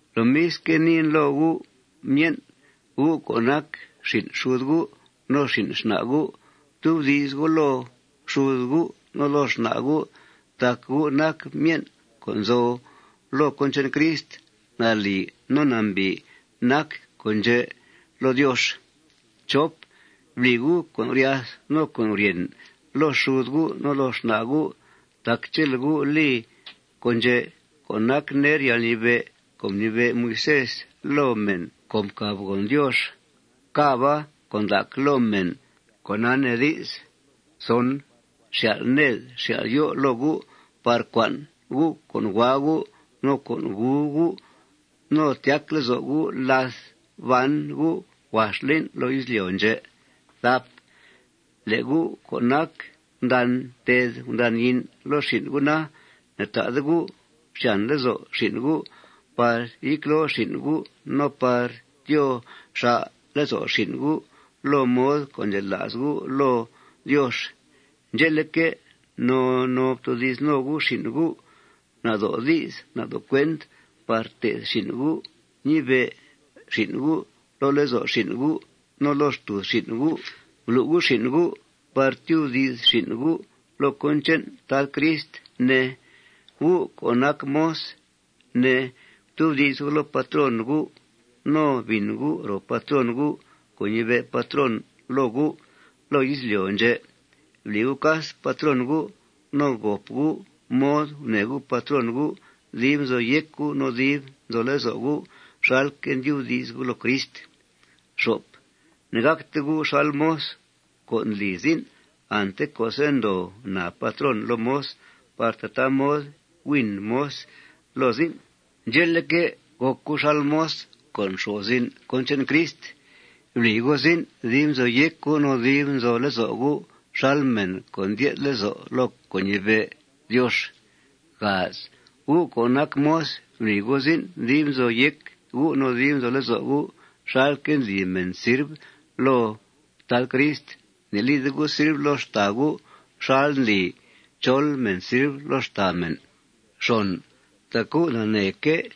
Lomisque', niin loo gu', myen', gu' co' nac xin' xud gu' no xin' xna' gu': Ftubdi's gu' loo xud gu' no loo xna' gu' tac gu' nac myen' co' nzo loo cón che'n Crist. Nalì no nambìi nac con' ndxè' loo Diox. Bli gu' con' guryath no con' guryèn loo xud gu' no loo xna' gu'. Tac chele' gu' li con' ndxè' co' nac ner yalnibe' co' mnibe' Moisés loo mèn co' mcàbgòn Diox càba con' ndac loo mèn, cona nee di's, xyal' ned xyal' yó' loo gu' par cua'n gu' co' hua gu' no co' gu gu' no tyac lezo' gu' láth ban gu' huax lín' loo izlyo' ndxè'. Le' gu' co' nac gundan ted gundan yín' loo xin' gu' na, ne'ta'de gu' xyàn lezo' xin' gu' par yecloo xin' gu' no par tyoo xà' lezo' xin' gu' loo mod co' ndxela's gu' loo Diox. Ndxe'leque', no no ftoodi's no gu' xin' gu' nado' di's no nado' cuent par té'th xin' gu' ñibe' xin' gu' loo lezo' xin' gu' no loo xtùuz xin' gu'. Blu' gu' xin' gu' par tyubdi's xin' gu' loo cón che'n Tad Crist, ne. Gu' co' nac moz, ne, ftubdi's gu' loo patrón gu' no bìn gu' ro patrón gu' co' ñibe' patrón loo gu' loo izlyo' ndxè'. Bli gu' cas patrón gu'. No gòp gu' mod gunèe gu' patrón gu' dib nzo yéc gu' no dib nzo lezo' gu' xalque' ndyubdi's gu' loo Crist. Ne'gàcte gu' xal moz co' ndli zin' ante co'se' ndoo naa patrón loo moz par tataa mod güin moz loo zin'. Ndxe'leque', gòc gu' xal moz co' nxo'f zin' cón che'n Crist. Bli gu' zin' dib nzo yéc gu' no dib nzo lezo' gu' xal mèn co' ndyé'th lezo' loo co' ñibe' Diox. Gu' co' nac moz, bli gu' zin' dib nzo yéc gu' no dib nzo lezo' gu' xalque' ndli mèn sirv loo Tad Crist. Ne'lide gu' sirv loo xtàa gu' xal ndli chol mèn sirv loo xtàa mèn. Tac gu' naneeque'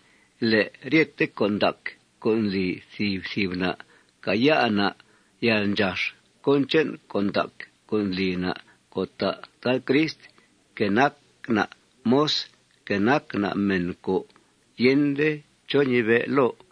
le' ryete con' ndac co' ndli thìb thìb na', càaya' na' yalndxax cón che'n con' ndac co' ndli na' co' ta' Tad Crist, que nac na' moz, que nac na' mèn co' yende chó ñibe' loo.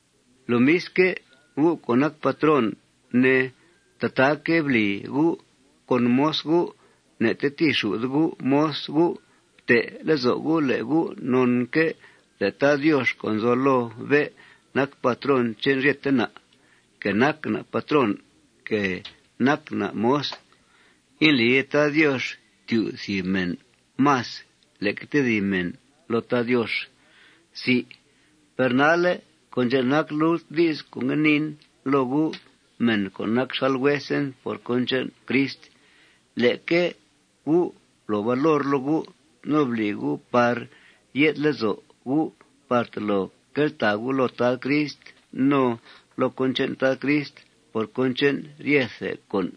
Lomisque', gu' co' nac patrón, ne, tataaque' bli gu' con moz gu'. Ne'tetìixù'de gu' moz gu'. Fte' lezo' gu' le' gu' nonque' le' Tad Diox, co' nzo loo bé', nac patrón che'n ryete na', que nac na' patrón, que nac na' moz. Indlide Tad Diox tyu' thìb mèn más leque tedib mèn loo Tad Diox. Per nalle' con' ndxè' nac lult di's co' ngue niin loo gu', mèn co' nac xal huesen por cón che'n Crist: Leque gu' blo valor loo gu' no bli gu' par ye'th lezo' gu' par tolo queltàa gu' loo Tad Crist no loo cón che'n Tad Crist por cón che'n ryethe con'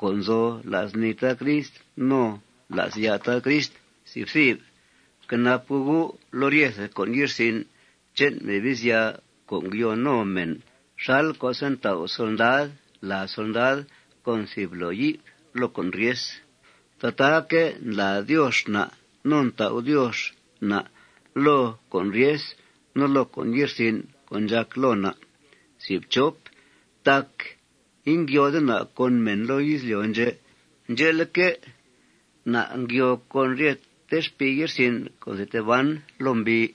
co' nzo la's nii Tad Crist no la's ya' Tad Crist. Fquenap gu' gu' loo ryethe con' ye'rsin' che'n Mebizya co' ngyoo no mèn. Xal co'se' ntau' solndad lad solndad con thìb bloo yi'f loo con' ryes, tataaque' ndlàa Diox na' no ntau' Diox na' loo con' ryes no loo con' ye'rsin' co' ndxàc loo na'. Tac ingyoode na' con mèn loo izlyo' ndxè'. Ndxe'leque', na' ngyoo con ryete xpii ye'rsin' co' nzi tee ban loo mbii.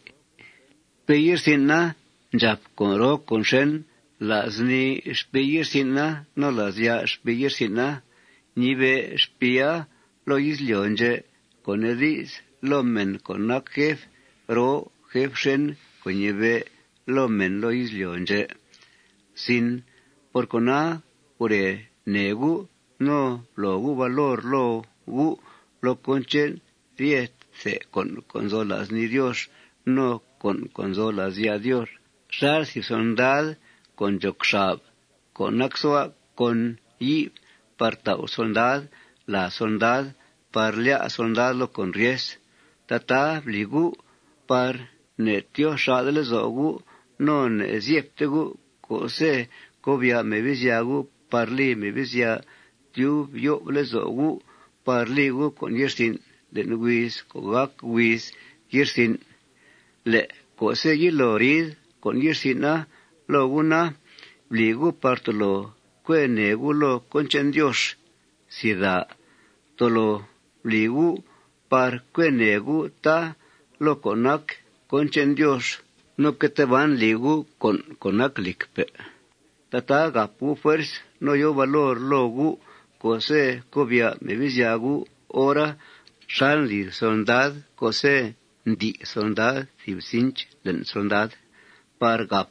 Xpii ye'rsin'a ndxàp con' roo con' xèn la's nii xpii ye'rsin'a no la's ya' xpii ye'rsin'a. Ñibe' xpiia loo izlyo' ndxè', co' nee di's, loo mèn co' nac jef roo jef xèn co' ñibe' loo mèn loo izlyo' ndxè'. Por cona, gure nèe gu' no blo gu' valor loo gu' loo cón che'n ryethe con' co' nzo la's nii Diox no con' co' nzo la's ya' Diox xal thìb solndad co' ndxoc xab co' nacsua' con yi'f par tau' solndad lad solndad par lyá' solndad loo con' ryes. Tataa bli gu' par ne'tyoo xà'de lezo' gu' no ne'zyebte gu' co'se' cobya' Mebizya gu' par li Mebizya tyub yo'f lezo' gu' par li gu' con' ye'rsin' le'n huiz co' gàc huiz ye'rsin'. Le' co'se' yilo ri'th con' ye'rsin'a loo gu' na, bli gu' par tolo cue nèe gu' loo cón che'n Diox. Tolo bli gu' par cue nèe gu', tá, loo co' nac cón che'n Diox. No que tee ban li gu' con' co' nac lìcpe'. Tataa gàp gu' fuerz no yòo valor loo gu' co'se' cobya' Mebizya gu' hora xal ndli thìb solndad co'se' ntí' solndad thìb cinch le'n solndad par gàp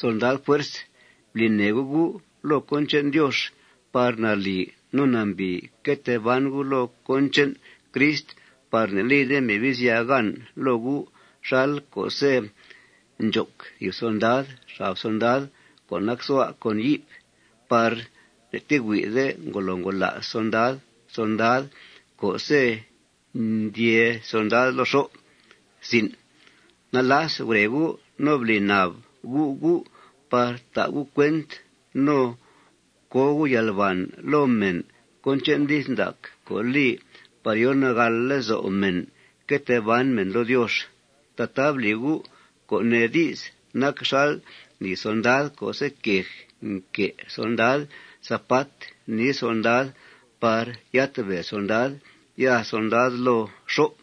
solndad fuerz. Bli nèe gu' gu' loo cón che'n Diox par nalì no nambìi que tee ban gu' loo cón che'n Crist par ne'lide Mebizya gan loo gu' xal co'se' ndxoc thìb solndad xab solndad co' nacsua' con yi'f par ne'tehuí'de ngolo ngola's solndad solndad co'se' ndyee solndad loo xó'. Nalas gure gu' no bli nab gu' gu' par ta' gu' cuent no co gu' yalbàn loo mèn cón che'n di's ndac co' li par yo nagàl lezo' mèn que tee ban mèn loo Diox. Tataa bli gu', co' nee di's, nac xal ndli solndad co'se' quej nque' solndad zapat nii solndad par yátbèe solndad ya solndad loo xó'.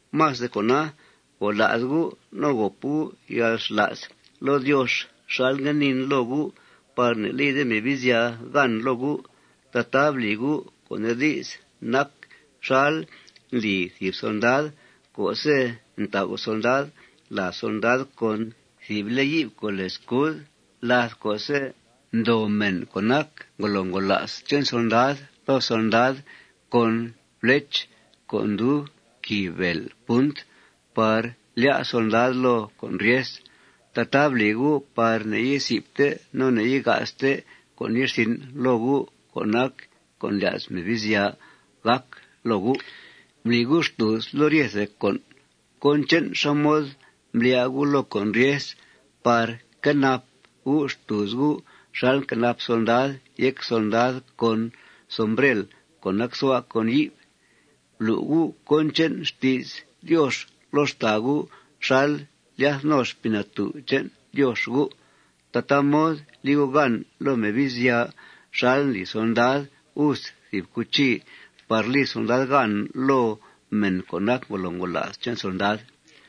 Más de cona, gola's gu' no gòp gu' yalxla's loo Diox xal ngue niin loo gu' par ne'lide Mebizya gan loo gu'. Tataa bli gu', co' nee di's, nac xal ndli thìb solndad co'se' ntau' solndad lad solndad con thìb le' yi'f co' lèe scud láth co'se' ndoo mèn co' nac ngolo ngola's che'n solndad loo solndad con flech, co' ndub quìi bèel punt, par lyá' solndad loo con' ryesa. Tataa bli gu' par ne'yizi'fte no ne'yiga'ste con' ye'rsin' loo gu' co' nac con' ndlya's Mebizya gàc loo gu'. Bli gu' xtùuz loo ryethe con' cón che'n xá mod mblyá' gu' loo con' ryes par quenap gu' xtùuz gu' xal nquenap solndad yéc solndad con sombrel co' nacsua' con yi'f. Blu' gu' cón che'n xti's Diox loo xtàa gu' xal ndlyath no Xpii Natú' che'n Diox gu'. Tataa mod li gu' gan loo Mebizya xal ndli solndad us thìb cuchi par li solndad gan loo mèn co' nac ngolo ngola's che'n solndad.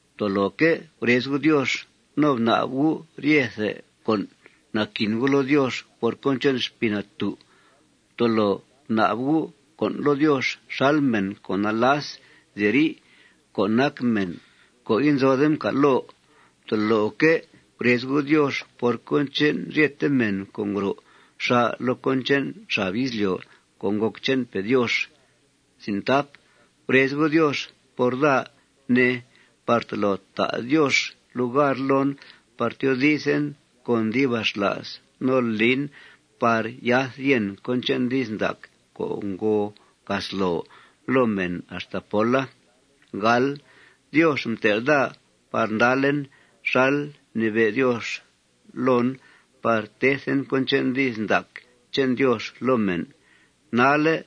Ftoloque' gurez gu' Diox no bnab gu' ryethe con' naquin gu' loo Diox por cón che'n Xpii Natú'. Ftolo bnab gu' con' loo Diox xal mèn co' nalas nziri' co' nac mèn co' inzode mcal' loo. Ftoloque' gurez gu' Diox por cón che'n ryete mèn co' ngro xà' loo cón che'n xab izlyo' co' ngòc che'npe' Diox. Gurez gu' Diox por daa, ne, par tolo ta' Diox lugar loon par tyoodizen con dibaxla's no lin par yath yèn cón che'n di's ndac co' ngo casloo loo mèn axta póla. Diox mtel' daa par ndalen xal mnibe' Diox loon par tethen cón che'n di's ndac che'n Diox loo mèn. Nalle'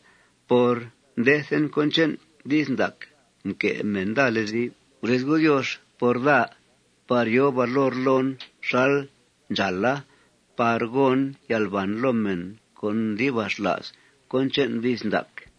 por mdethen cón che'n di's ndaca, mque' mèn daa lezi'f. Gurez gu' Diox par daa par yòo valor loon xal ndxàala par gon yalbàn loo mèn con dibaxla's cón che'n di's ndaca.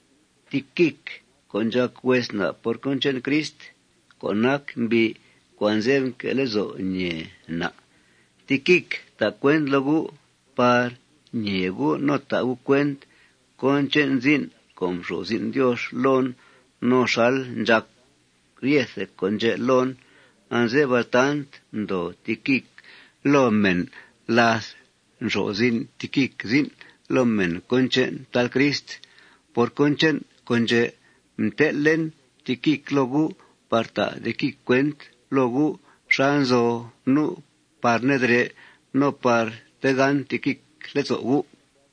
Tiquic co' ndxàc hues na' por cón che'n Crist, co' nac mbi' co' anze'f nque' lezo' ñèe na', Tiquic ta' cuent loo gu' par ñee gu' no ta' gu' cuent cón che'n zin' co' mxo'f zin' Diox loon no xal ndxàc ryete con' ndxè' loon. Anze'f altant ndoo Tiquic loo mèn láth nxo'f zin' Tiquic zin' loo mèn cón che'n Tad Crist. Por cón che'n con' ndxè' mtel'en Tiquic loo gu' par ta' Tiquic cuent loo gu' xá nzo nu' par nedrè' no par tegán Tiquic lezo' gu'.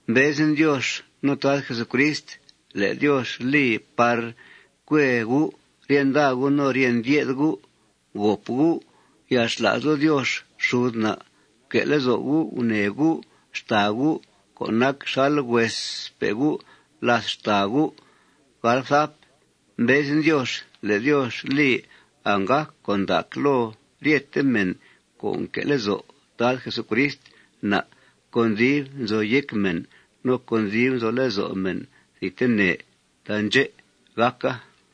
Mbezen Diox no Tad Jesucrist le' Diox li par cue gu' rye nda gu' no rye ndye'th gu'. Gòp gu' yalxla's loo Diox xud na'. Fque' lezo' gu' gunèe gu' xtàa gu' co' nac xal huespe' gu' làth xtàa gu'. Mbezen Diox le' Diox li anggàc con' ndac loo ryete mèn co' nque' lezo' Tad Jesucrist na' con dib nzo yéc mèn no con dib nzo lezo' mèn thidtene. Taandxè' gàca.